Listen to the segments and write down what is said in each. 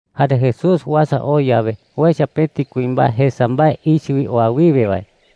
Jare Jesús uasa oo yawe, uecha pëti kuimbae jesa mbae ichɨ wi oa wiwe wae.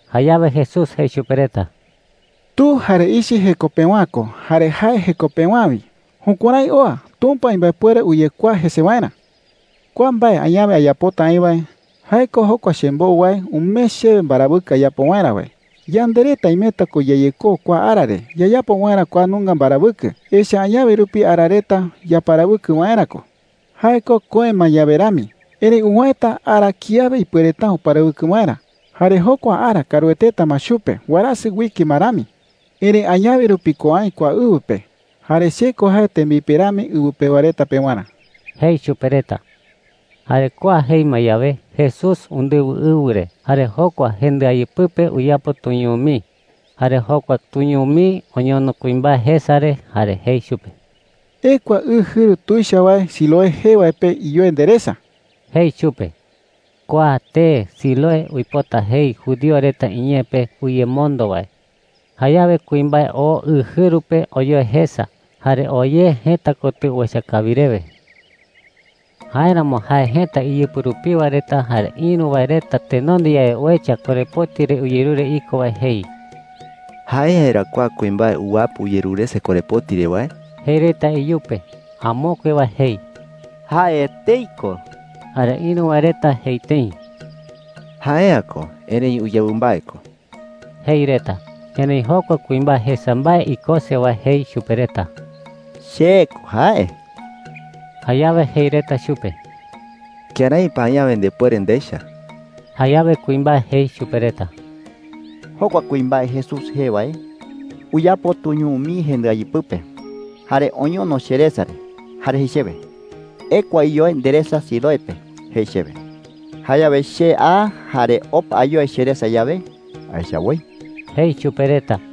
Jayawe Jesús jei chupe reta: “Tu jare ichɨ jeko pewa’ä ko, jare jae jeko pewa’ä wi. Jukuärái oa Tumpa imbaepuere uyekuaa jese waerä,” jei. “Kua mbae añawe ayapota aï wae, jae ko jokua chembou wae umee chewe mbarawɨkɨ ayapo waerä wae. Yande reta imeta ko yayekou kua ara re yayapo waerä kua nunga mbarawɨkɨ. Echa’ä añawe rupi ara reta yaparawɨkɨ waerä ko. Jae ko köe ma yawe rami. Erëi uwäeta ara kiawe ipuereta’ä uparawɨkɨ waerä. Jare jokua ara kaarueteta ma chupe warasɨ uike ma rami. Erëi añawe rupi ko aï kua ɨwɨ pe. Jare che ko jae tembipe rami ɨwɨ pewa reta pewarä,” jei chupe reta. Jare kua jei ma yawe, Jesús undɨwɨ ɨwɨ re jare jokua jendɨayɨ pɨpe uyapo tuñuu mii. Jare jokua tuñuu mii oñono kuimbae jesa re jare jei chupe: “Ekua ɨ jɨru tuicha wae Siloé jee wae pe iyoe nderesa,” jei chupe. Kua tee Siloé uipota jei judío reta iñee pe ‘uyemondo wae.’ Jayawe kuimbae oo ɨ jɨru pe oyoe jesa, jare oo ye jëta kotɨ uecha kawi rewe. Jáeramo jae jëta iyɨpɨ rupiwa reta jare ïru wae reta tenonde yawe uecha korepoti re uyerure iko wae jei: “¿Jae’ä yerá kua kuimbae uwapɨ uyerurese korepoti re wae?” jei reta iyupe. Amokue wae jei: “Jae etei ko.” Jare ïru wae reta jei tëi: “Jae’ä ko, erëi uyawɨ mbae ko,” jei reta. Erëi jokua kuimbae jesa mbae ikose wae jei chupe reta: “Che ko jae.” Jayawe jei reta chupe: “¿Kërái pa añawe ndepuere ndecha?” Jayawe kuimbae jei chupe reta: “Jokua kuimbae Jesús jee wae uyapo tuñuu mii jendɨayɨ pɨpe, jare oñono cheresa re, jare jei chewe, ‘Ekua iyoe nderesa Siloé pe,’ jei chewe. Jayawe che a, jare opa ayoe cheresa yawe, aecha woi,” jei chupe reta.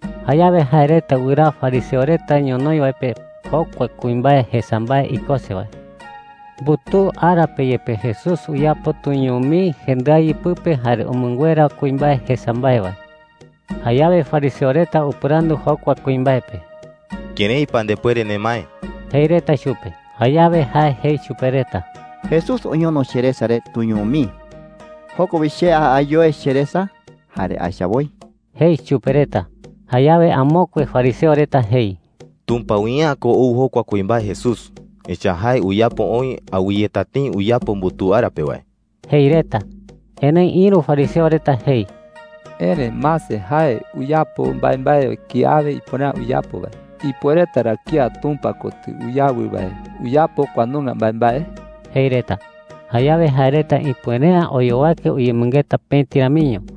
Jayawe jae reta wɨraa fariseo reta ñonoï wae pe jokua kuimbae jesa mbae ikose wae. Mbutuu ara pe yepe Jesús uyapo tuñuu mii jendɨayɨ pɨpe jare umɨnguera kuimbae jesa mbae wae. Jayawe fariseo reta upɨrandu jokua kuimbae pe: “¿Kërái pa ndepuere nemae?” jei reta chupe. Jayawe jae jei chupe reta: “Jesús oñono cheresa re tuñuu mii. Joko wi che a ayoe cheresa jare aecha woi,” jei chupe reta. Jayawe amokue fariseo reta jei: “Tumpa wi’ä ko ou jokua kuimbae Jesús. Echa’ä jae uyapo oï awɨyeta tëi uyapo mbutuu ara pe wae,” jei reta. Erëi ïru fariseo reta jei: “Erëi, mase, jae uyapo mbaembae kiawe ipuere’ä uyapo wae. ¿Ipuereta ra kía Tumpa kotɨ uyawɨ wae uyapo kua nunga mbaembae?” jei reta. Jayawe jae reta ipuere’ä oyowake uyemɨngeta pëti ramiño.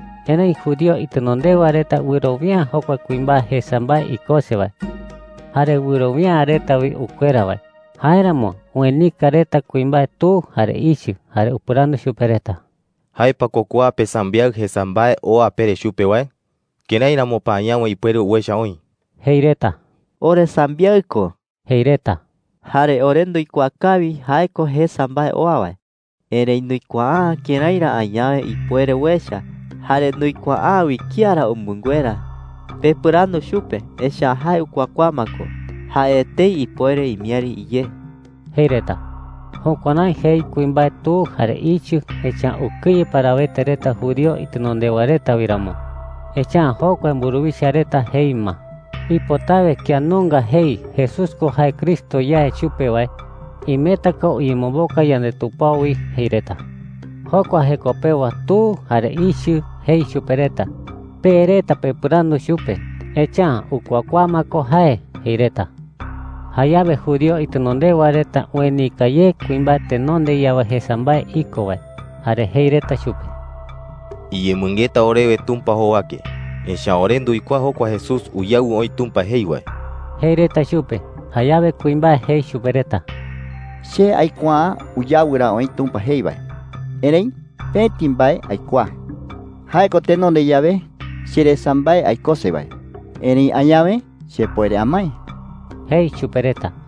Erëi judío itenondewa reta wɨrowia’ä jokua kuimbae jesa mbae ikose wae. Jare wɨrowia’ä reta wi ukuera wae. Jáeramo uenika reta kuimbae tu jare ichɨ. Jare upɨrandu chupe reta: “¿Jae pa ko kua pesambiaɨ jesa mbae oa pere chupe wae? ¿Kërái ramo pa añawe ipuere uecha oï?” jei reta. “Oresambiaɨ ko,” jei reta. “Jare ore nduikuaa kawi jae ko jesa mbae oa wae. Erëi nduikuaa’ä kërái ra añawe ipuere uecha. Jare nduikuaa’ä wi kía ra umɨnguera. Pepɨrandu chupe, echa’ä jae ukuakuaa ma ko. Jae etei ipuere imiäri iyé,” jei reta. Jukuärái jei kuimbae tu jare ichɨ, echa’ä ukɨye parawete reta judío itenondewa reta wi ramo. Echa’ä jokua mburuwicha reta jei ma, “Ipotawe kía nunga jei ‘Jesús ko jae Cristo yae chupe wae,’ imeta ko uyemomboka yandetupao wi,” jei reta. Jokua jeko pewa tu jare ichɨ jei chupe reta: “Pe reta pepɨrandu chupe, echa’ä ukuakuaa ma ko jae,” jei reta. Jayawe judío itenondewa reta uenika ye kuimbae tenonde yawe jesa mbae iko wae, jare jei reta chupe: “Iyemɨngeta orewe Tumpa jowake. Echa’ä ore nduikuaa jokua Jesús uyawɨ oï Tumpa jei wae,” jei reta chupe. Jayawe kuimbae jei chupe reta: “Che aikuaa’ä uyawɨ ra oï Tumpa jei wae. Erëi pëti mbae aikuaa: jae ko tenonde yawe cheresa mbae aikose wae, erëi añawe chepuere amae,” jei chupe reta.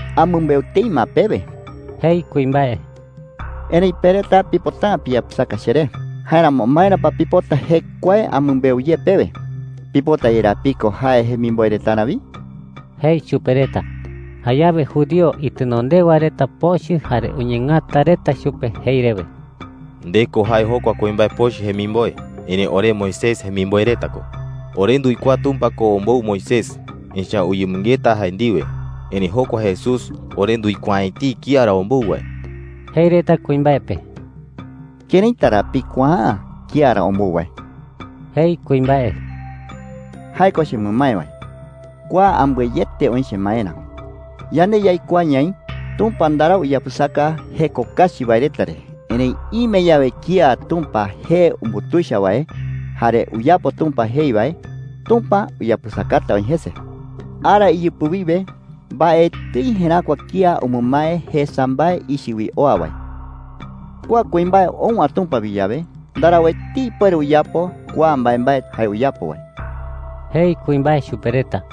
“Amɨmbeu tëi ma pewe,” jei kuimbae, “erëi pe reta pipota’ä piyapɨsaka cheré. Jáeramo, ¿maera pa pipota jekuae amɨmbeu ye pewe? ¿Pipota yerá piko jae jemimboe retarä wi?” jei chupe reta. Jayawe judío itenondewa reta pochɨ jare uñeengata reta chupe jei rewe: “Nde ko jae jokua kuimbae pochɨ jemimboe. Erëi ore Moisés jemimboe reta ko. Ore nduikuaa Tumpa ko ombou Moisés, echa’ä uyemɨngeta jae ndiwe. Erëi jokua Jesús, ore nduikuaa’ä etei kía ra ombou wae,” jei reta kuimbae pe. “¿Këraita ra pikuaa’ä kía ra ombou wae?” jei kuimbae. “Jae ko chemɨmae wae. Kua ambɨe yeete oï chemaerä. Yande yaikuaa ñaï Tumpa ndarau uyapɨsaka jeko kachi wae reta re. Erëi ime yawe kía Tumpa jee umbutuicha wae jare uyapo Tumpa jei wae, Tumpa uyapɨsakata oï jese,” jei chupe reta. “Ara iyɨpɨ wiwe mbaetɨi jeräkua kía umɨmae jesa mbae ichɨ wi oa wae. Kua kuimbae ou’ä Tumpa wi yawe, ndarau etei ipuere uyapo kua mbaembae jae uyapo wae,” jei kuimbae chupe reta.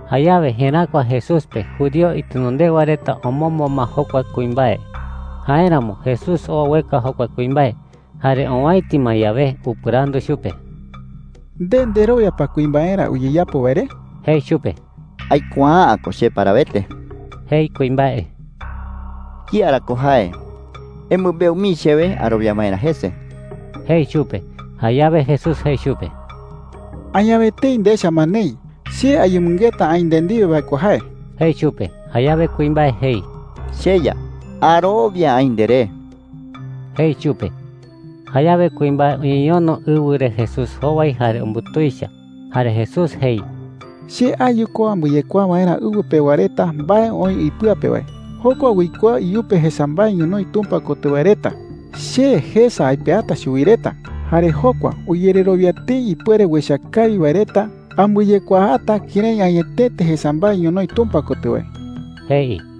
Jayawe jeräkua Jesús pe judío itenondewa reta omombo ma jokua kuimbae. Jáeramo Jesús oo ueka jokua kuimbae. Jare owäiti ma yawe, upɨrandu chupe: “¿Nde nderowia pa kuimbaerä ayeyapo wae re?” jei chupe. “Aikuaa’ä ko che parawete,” jei kuimbae. “¿Kía ra ko jae? Emɨmbeu mii chewe arowia waerä jese,” jei chupe. Jayawe Jesús jei chupe: “Añawe etei ndecha ma neï. Che ayemɨngeta aï nde ndiwe wae ko jae,” jei chupe. Jayawe kuimbae jei: “CheYa, arowia aï nderé,” jei chupe. Jayawe kuimbae uñeñono ɨwɨ re Jesús jowai jare umbutuicha. Jare Jesús jei: “Che ayu ko ambɨyekuaa waerä ɨwɨ pewa reta mbae oï ipɨa pe wae. Jokua uikuaa iyupe jesa mbae ñonoï Tumpa kotɨ wae reta, che jesa aipeata chuwi reta. Jare jokua uyererowia tëi ipuere uecha kawi wae reta, ambɨyekuaata kërái añetete jesa mbae ñonoï Tumpa kotɨ wae,” jei.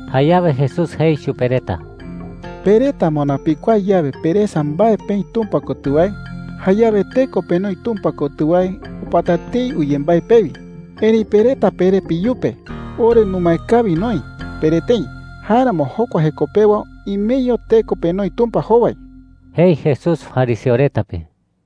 Jayawe Jesús jei chupe reta: “Pe reta moná pikuaa yawe peresa mbae peï Tumpa kotɨ wae, jayawe teko penoi Tumpa kotɨ wae opata tëi uyembái pewi. Erëi pe reta pere peyupe, ‘Ore numae kawi noï,’ pere tëi. Jáeramo jokua jeko pewa imeño teko penoi Tumpa jowai,” jei Jesús fariseo reta pe.